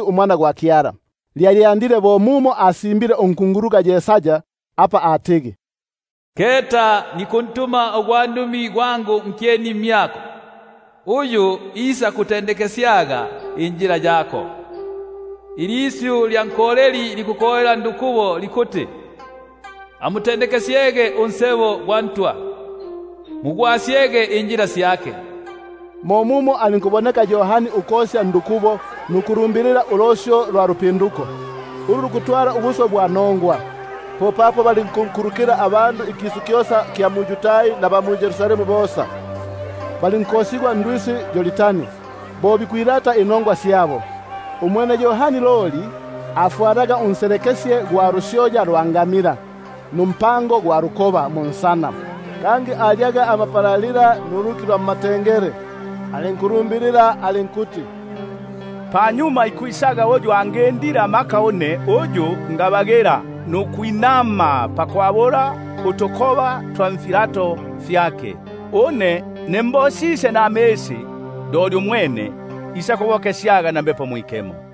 uMwana gwa Kyala. Lili bo apa lisimbigwe mwa Yesaya unkunguluka, ukuti: Keta nikuntuma ugwandumi gwangu nkyeni mmyako, Uyu isakutendekesya injila yako; Ilisyu lya nkoleli likukolela ndukubo: Amutendekesyege injila ya Ntwa, Mugolosyege imisebo gyake. Mo mumo abonekile Yohani ukosya ndukubo nukulumbilila ulosyo lwa lupinduko, ulu lukutwala ubuswe bwa nongwa. Popapo balinkunkulukila abandu ikisu kyosa kya mu-Yudai naba mu-Yerusalemu bosa, balinkosigwa ndwisi Yordani, bo bikwilata inongwa syabo. Umwene Yohani afwalaga unselekesye gwa lusyoya lwa ngamila, numpango gwa lukoba munsana; kangi alyaga amapalalila nuluki lwa mmatengele. Alinkulumbilila alinkuti: Panyuma pamyangu ikwisa uyu angindile amaka une, uyu ngabagila nukwinama pakwabula utukoba twa nifilato fyake. Une ne mbosisye namisi, umwene isakubokesyaga na Mbepo Mwikemo.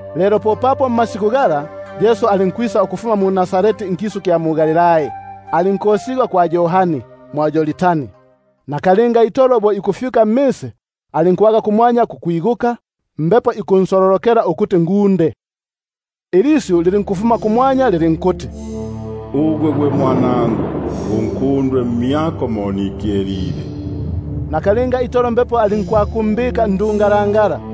Lelo popapo mmasiku gala, Yesu alinkwisa ukufuma mu-Nazareti nkisu kya mu-Galilai, alinkosigwa kwa Yohani mwa Yordani. Nakalinga itolo bo ikufyuka mmisi, alinkwaga kumwanya kukwiguka, Mbepo ikunsololokela ukuti ngunde; ilisyu lilinkufuma kumwanya lilinkuti: Ugwe gwe Mwanangu unkundwe, mmyako mo nikyelile. Nakalinga itolo Mbepo alinkwakumbika ndungalangala;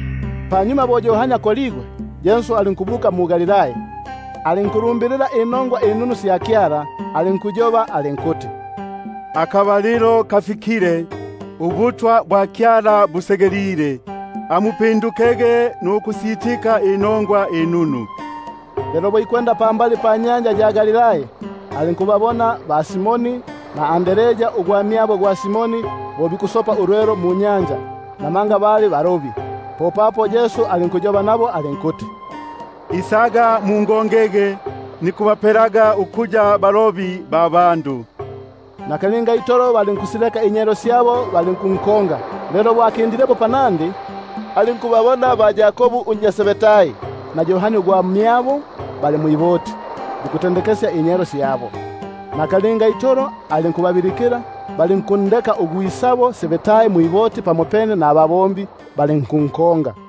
Panyuma bo akoligwe Yohani, Yesu alinkwisa mu-Galilai, alinkulumbilila inongwa inunu sya Kyala, alinkuti: Akabalilo kafikile, ubutwa bwa Kyala busegelile; amupindukege nukusitika inongwa inunu. Lelo bo ikwenda pambali panyanja ya Galilai, alinkubabona ba-Simoni na Andrea ugwamyabo gwa Simoni, bo bikusopa ulwelo munyanja; namanga bali balobi. Yesu alinkuyoba nabo alinkuti: Isaga mungongege, nikubapelaga ukuya balobi ba bandu. Nakalinga itolo balinkusileka inyelo syabo, balinkunkonga. Lelo bo akindilepo panandi, alinkubabona ba-Yakobu unnya Zebedai na Yohani ugwamyabo bali mwi- boti, bikutendekesya inyelo syabo. Nakalinga itolo alinkubabilikila; balinkundeka ugwisabo Zebedai mwiboti pamopene nababombi, balinkunkonga.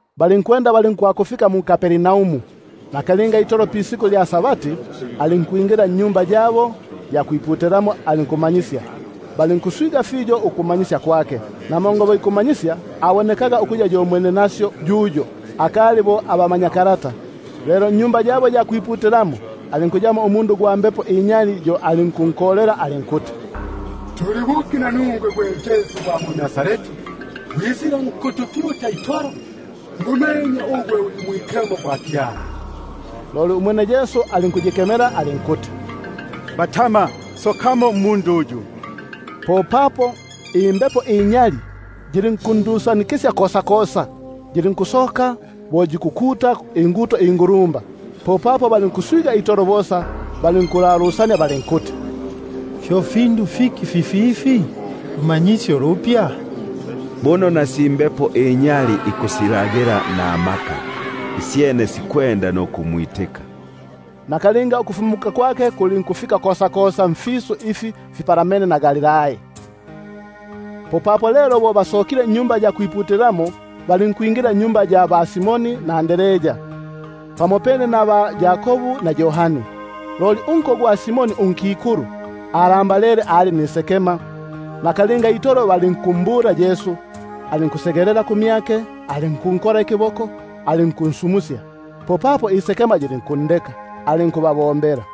Balinkwenda balinkwakufika mu-Kapernaumu. Lelo pisiku lya Sabati alinkwingila mu-Sinagogi alinkumanyisya. Balinkuswiga fiyo ukumanyisya kwake, namanga bo ikubamanyisya abonekaga ukuya yo mwenenasyo yuyo, akali bo abamanyakalata. Lelo mu-Sinagogi yabo alimo umundu ugwa mbepo inyali, yo alinkukolela alinkuti: Tuli buki nanuswe nanungwe, gwe Yesu gwa mu-Nazareti? Gwisile nkutupyuta itolo? Ngumenye ugwe, uli Mwikemo gwa Kyala. Umwene Yesu alinkuyikemela, alinkuti: Batama! usokemo mmundu uyu. Popapo imbepo inyali yilinkundusanikisya kosakosa, yilinkusoka bo yikukuta inguto ingulumba. Balinkuswiga itolo bosa, balinkulalusania balinkuti: Fyo fiki fififi? Lumanyisyo lupya! buno na si mbepo inyali ikusilagila namaka, isyene sikwenda nukumwitika. Nakalinga ukufumuka kwake kulinkufika kosakosa, mfisu ifi fipalamene na Galilai. Lelo bo basokile mu-Sinagogi, balinkwingila nnyumba ya ba-Simoni na Andrea. Bali pamopene na ba-Yakobu na Yohani. Loli unko gwa Simoni unkikulu alambalele, ali nisekema. Balinkusita nukuhaba ukumbula. Bo asegelile kumyake, alinkunkola ikiboko alinkunsumusya. Popapo isekema yilinkundeka, alinkubabombela.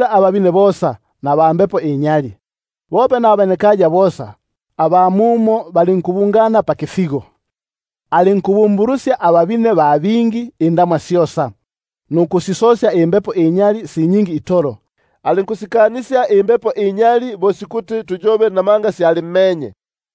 ababine, naba mbepo inyali; bope naba nkaya mumo bosa balinkubungana pakifigo. Umwene alinkubabumbulusya ababine ba bingi indamwa syosa, nukusisosya imbepo inyali si nyingi itolo. Alinkusikanisya imbepo inyali bo sikuti tuyobe, namanga syalimmenye.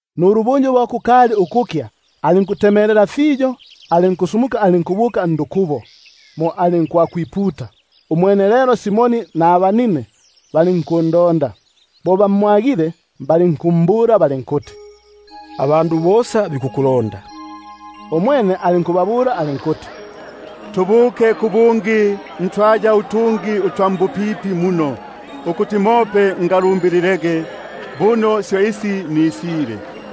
Nulubunju bo kukali ukukya alinkulembuka, alinkusoka alinkubuka ndukubo, mo alinkwakwiputa. Umwene lelo Simoni nabanine balinkundonda. Lelo bo bamwagile, bali- nkumbula balinkuti: Abandu bosa bakubingilile. Umwene alinkubabula alinkuti: Tubuke kubungi ntwaya utungi utwa mbupipi muno, ukuti mope ngalumbililege; buno syo isi nisile.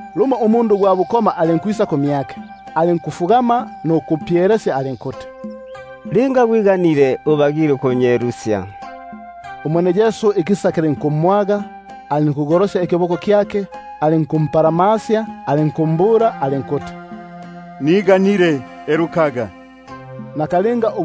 Lumo alinkwisa kumyake ugwa bukoma, alinkufugama nukupyelesya alinkuti: Linga gwiganile, ubagile ukunyelusya. Umwene bo ikisa kimwagile, alinkugolosya ikiboko kyake, alinkumpalamasya alinkuti: Niganile, elukaga. Nakalinga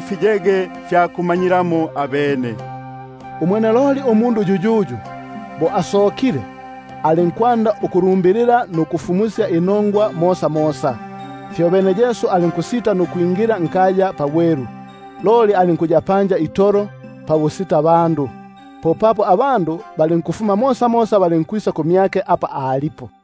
fiyege fya kumanyilamo abene. Umwene loli bo asokile alinkwanda ukulumbilila nukusifumusya inongwa sisisi; fyobene Yesu alinkusita nukwingila nkaya pabwelu, alinkuya pabusitabandu. Popapo balinkufuma mosamosa ukubuka apa alipo.